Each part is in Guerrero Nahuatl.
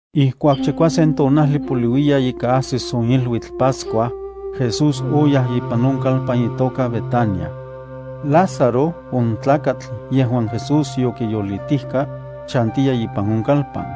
Ijkuak chikuasen tonajli poliuiya ika ajsis on iluitl Pascua, Jesús oyaj ipan on kalpan itoka Betania. Lázaro on tlakatl yejuan Jesús yokiyolitijka, chantiya ipan on kalpan.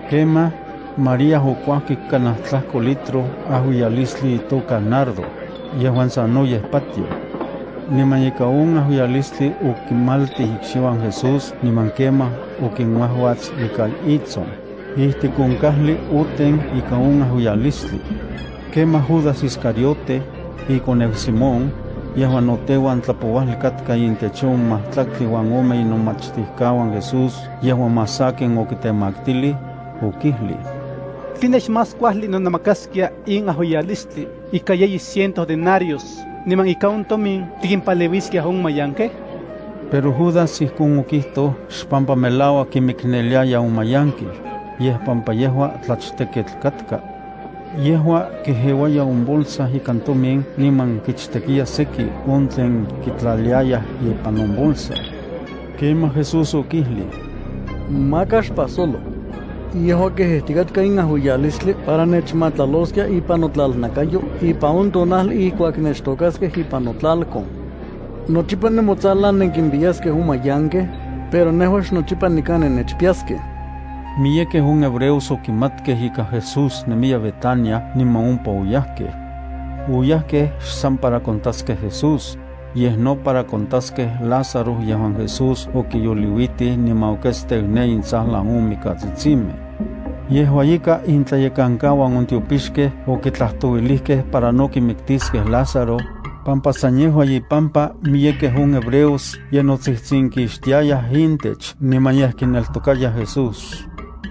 Kemaj, María okuajkik kanaj tlajko litro ajuiyalistli itoka nardo, yejuan sanoyej patioj. Niman ikan on ajuiyalistli okimaltij ikxiuan Jesús niman kemaj okinuajuats ikan itson. Ijtik on kajli oten ikan on ajuiyalistli. Kemaj Judas Iscariote, (ikoneu Simón, yejuan no teuan tlapouajli katka intech on majtlaktli uan ome inomachtijkauan Jesús yejuan más sakin okitemaktilij), okijlij: —¿Tline xmás kuajli nonemakaskia in ajuiyalistli ika yeyi ciento denarios niman ika on tomin tikimpaleuiskiaj on mayankej? Pero Judas ijkon okijtoj xpampa melauak kimikneliaya on mayankej, yej pampa yejua tlachtekketl katka. Yejua kejeuaya on bolsa ikan tomin niman kichtekiya seki on tlen kitlaliayaj ipan on bolsa. Kemaj Jesús okijlij: —Maka xpajsolo. Yejua kejejtikatka in ajuiyalistli para nechmatlaloskia ipan notlalnakayo ipan on tonajli ijkuak nechtôkaskej ipan notlalkon. Nochipa nemotsajlan nenkimpiyaskej on mayankej, pero nejua xnochipa nikan nennechpiyaskej. Miyekej on hebreos okimatkej ika Jesús nemiya Betania niman ompa oyajkej. Oyajkej xsan para kontaskej Jesús, yej no para kontaskej Lázaro yejuan Jesús okiyoliuitij niman oketsteu ne intsajlan on mikatsitsimej. Yejua ika intlayekankauan on tiopixkej okitlajtouilijkej para no kimiktiskej Lázaro, pampa san yejua ipampa miyekej on hebreos ye notsijtsinkixtiayaj intech niman yej kineltokayaj Jesús.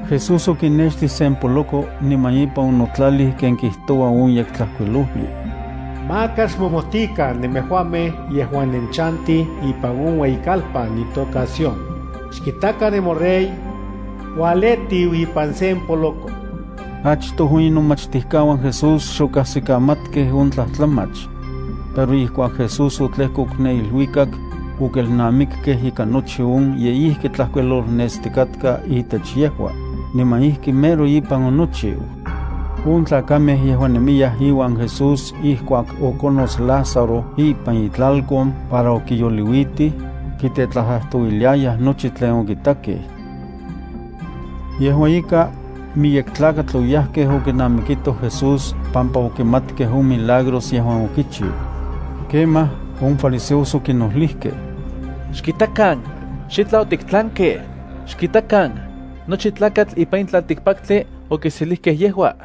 Jesús okinextij sen poloko niman ipan onotlalij ken kijtoua on Yektlajkuilojli: Maka xmomojtikan nemejuamej yejuan nenchantij ipan on ueyikalpan itoka Sión. Xkitakan, nemoRey. Ualetiu ipan sen poloko. Achtoj on inomachtijkauan Jesús xokajsikamatkej on tlajtlamach. Pero ijkuak Jesús otlejkok ne iluikak, okelnamikkej ika nochi on ye ijki tlajkuilolnestikatka itech yejua, niman ijki mero ipan onochiu. On tlakamej yejuan nemiyaj iuan Jesús ijkuak okonots Lázaro ipan itlalkon para okiyoliuitij, kitetlajtlajtouiliayaj nochi tlen okitakej. Yejua ika, miyek tlakatl oyajkej okinamikitoj Jesús pampa okimatkej on milagros yejuan okichiu. Kemaj on fariseos okinojlijkej: —¡Xkitakan, xitlaj otiktlankej! ¡Xkitakan, nochi tlakatl ipan in tlaltikpaktli okiselijkej yejua!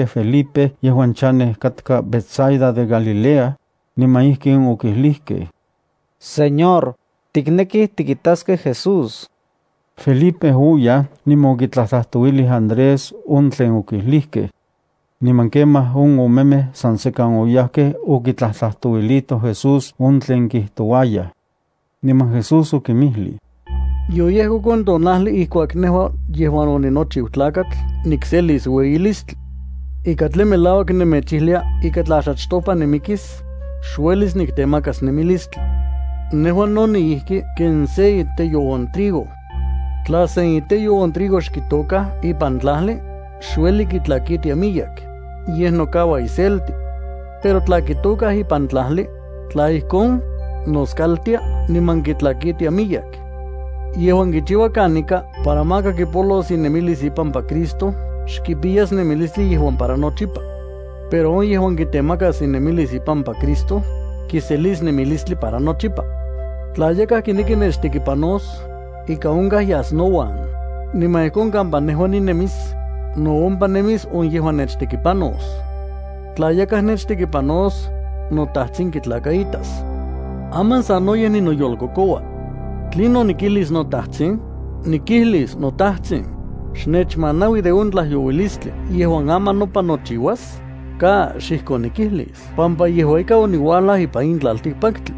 Yejuamej okinisiuijkej Felipe yejuan chanej katka Betsaida de Galilea, niman ijkin okijlijkej: —Señor, tiknekij tikitaskej Jesús. Felipe oyaj niman okitlajtlajtouilij Andrés on tlen okijlijkej. Niman kemaj on omemej san sekan oyajkej okitlajtlajtouilitoj Jesús on tlen kijtouayaj. Niman Jesús okinmijlij: —Yoyejkok on tonajli ijkuak nejua yejuan oninochiu Tlakatl nikselis ueyilistli. Ika tlen melauak nemechijlia ika tla xachtopa nimikis, xuelis niktemakas nemilistli. Nejua no niijki ken se iteyo on trigo. Tla se iteyo on trigo xkitôkaj ipan tlajli, xueli kitlakitia miyek, yej nokaua iselti. Pero tla kitôkaj ipan tlajli, tla ijkon, noskaltia niman kitlakitia miyek. Yejuan kichiua kanika para maka kipolos inemilis ipampa Cristo xkipiyas nemilistli yejuan para nochipa. Pero on yejuan kitemaka inemilis ipampa Cristo, kiselis nemilistli para nochipa. Tla yakaj kineki nechtekipanos, ika onkaj yas nouan, niman ijkon kampa nejua ninemis, no ompa nemis on yejuan nechtekipanos. Tla yakaj nechtekipanos, noTajtsin kitlakaitas. ’Aman sanoyej ninoyolkokoua. ¿Tlinon nikijlis noTajtsin? ¿Nikijlis: “NoTajtsin, xnechmanaui de on tlajyouilistli yejuan aman nopan nochiuas”? ¡Ka! Xijkon nikijlis pampa yejua ika oniuajlaj ipan in tlaltikpaktli.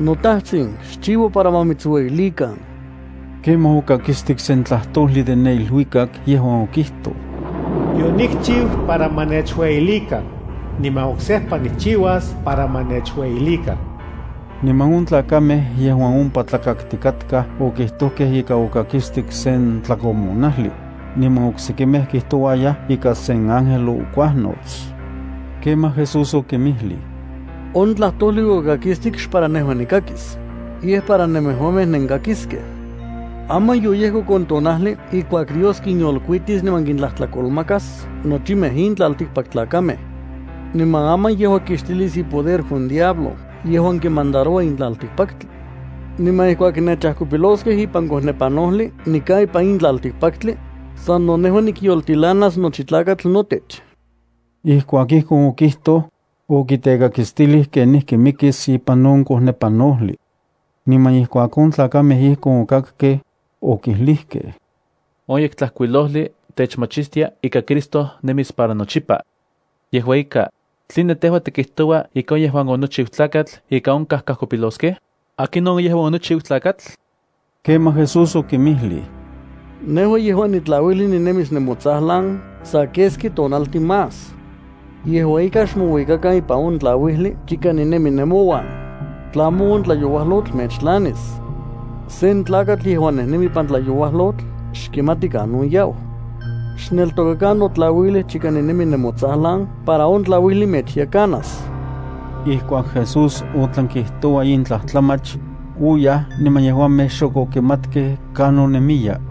NoTajtsin, xchiua para ma mitsueyilikan. Kemaj okakistik sen tlajtojli de ne iluikak yejuan okijtoj: “Yonikchiu para ma nechueyilikan, niman oksejpa nikchiuas para ma nechueyilikan.” Niman on tlakamej yejuan ompa tlakaktikatkaj okijtojkej ika okakistik sen tlakomonajli, niman oksekimej kijtouayaj ika sen ángel okuajnots. Kemaj Jesús okinmijlij: —On tlajtojli okakistik xpara nejua nikakis, yej para nemejuamej nenkakiskej. Aman yoyejkok on tonajli ijkuak Dios kinyolkuitis niman kintlajtlakolmakas nochimej in tlaltikpaktlakamej. Niman aman yejua kixtilis ipoder on diablo yejuan kimandaroua in tlaltikpaktli. Niman ijkuak nechajkopiloskej ipan kojnepanojli nikan ipan in tlaltikpaktli, sano nejua nikyoltilanas nochi tlakatl notech. Ijkuak ijkon okijtoj, okitekakistilij kenijki mikis ipan on kojnepanojli. Niman ijkuak on tlakamej ijkon okakkej, okijlijkej: —On Yektlajkuilojli techmachistia ika Cristo nemis para nochipa. Yejua ika, ¿tline tejua tikijtoua ika on yejuan onochiu Tlakatl ika onkaj kajkopiloskej? ¿Akinon on yejuan onochiu Tlakatl? Kemaj Jesús okinmijlij: —Nejua yejuan nitlauijli ninemis nemotsajlan sa keski tonaltin más. Yejua ika, xmouikakan ipan on notlauil chika ninemi nemouan, tlamo on tlayouajlotl mechtlanis. Sen tlakatl yejuan nejnemi ipan tlayouajlotl xkimati kanon yau. Xneltokakan notlauil chika ninemi nemotsajlan para on tlauijli mechyekanas. Ijkuak Jesús otlan kijtoua in tlajtlamach, oyaj niman yejuamej xok okimatkej kanon nemiya.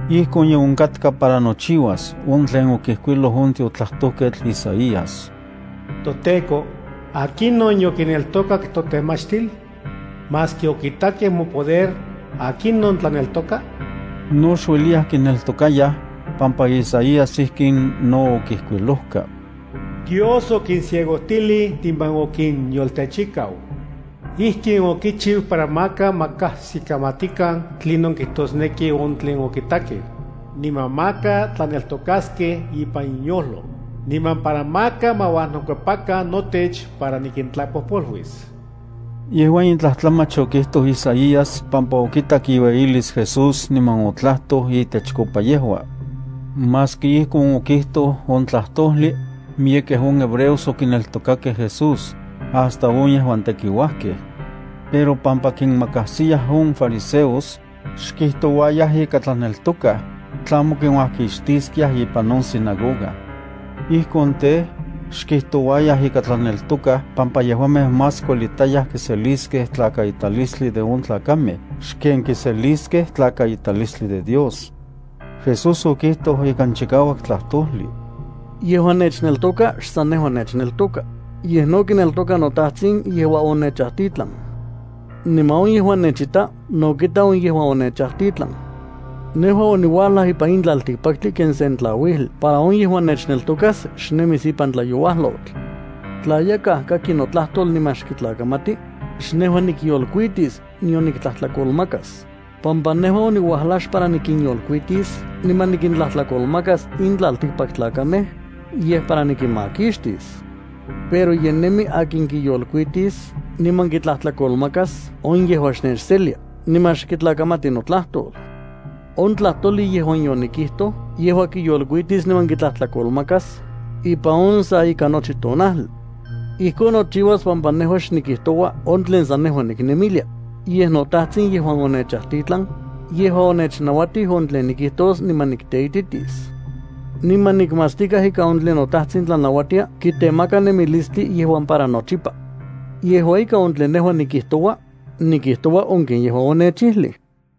Ijkon ye onkatka para nochiuas on tlen okijkuiloj on tiotlajtojketl Isaías: ToTEKO, ¿akinon yokineltokak totemachtil? Maski okitakej mopoder, ¿akinon tlaneltoka? No xueliyaj kineltokayaj, pampa Isaías ijkin no okijkuilojka: Dios okinciegojtilij niman okinyoltechikau. Ijkin okichiu para maka ma kajsikamatikan tlinon kijtosneki on tlen okitakej, niman maka tlaneltokaskej impan inyojlo, niman para maka ma uajnokuepakan notech para nikintlapojpoluis. Yejua in tlajtlamach okijtoj Isaías pampa okitak iueyilis Jesús niman otlajtoj itechkopa yejua. Maski ijkon okijtoj on tlajtojli, miyekej on hebreos okineltokakej Jesús, hasta on yejuan tekiuajkej. Pero, pampa kinmakajsiyaj on fariseos, xkijtouayaj ika tlaneltokaj tlamo kinuakixtiskej ipan on sinagoga. Ijkon tej, xkijtouayaj ika tlaneltokaj pampa yejuamej más kuelitayaj kiseliskej tlakaitalistli de on tlakamej xken kiseliskej tlakaitalistli de Dios. Jesús okijtoj ikan chikauak tlajtojli: —Yejuan nechneltoka xsan nejua nechneltoka, yej no kineltoka noTajtsin yejuan onechajtitlan. Niman on yejuan nechita no kita on yejuan onechajtitlan. Nejua oniuajlaj ipan in tlaltikpaktli ken sen tlauijli para on yejuan nechneltokas xnemis ipan tlayouajlotl. Tla yakaj kaki notlajtol niman xkitlakamati, xnejua nikyolkuitis nion nikitlajtlakolmakas, pampa nejua oniuajlaj xpara nikinyolkuitis niman nikintlajtlakolmakas in tlaltikpaktlakamej, yej para nikinmakixtis. Pero ye nemi akin kiyolkuitis niman kitlajtlakolmakas on yejuan xnechselia niman xkitlakamati notlajtol. On tlajtojli yejuan yonikijtoj yejua kiyolkuitis niman kitlajtlakolmakas ipan on sa ika nochi tonajli. Ijkon nochiuas pampa nejua xnikijtoua on tlen san nejua niknemilia, yej noTajtsin, yejuan onechajtitlan, yejua onechnauatij on tlen nikijtos niman nikteititis. Niman nikmatstikaj ika on tlen noTajtsin tlanauatia kitemaka nemilistli yejuan para nochipa. Yejua ika, on tlen nejua nikijtoua, nikijtoua on ken yejua onechijlij.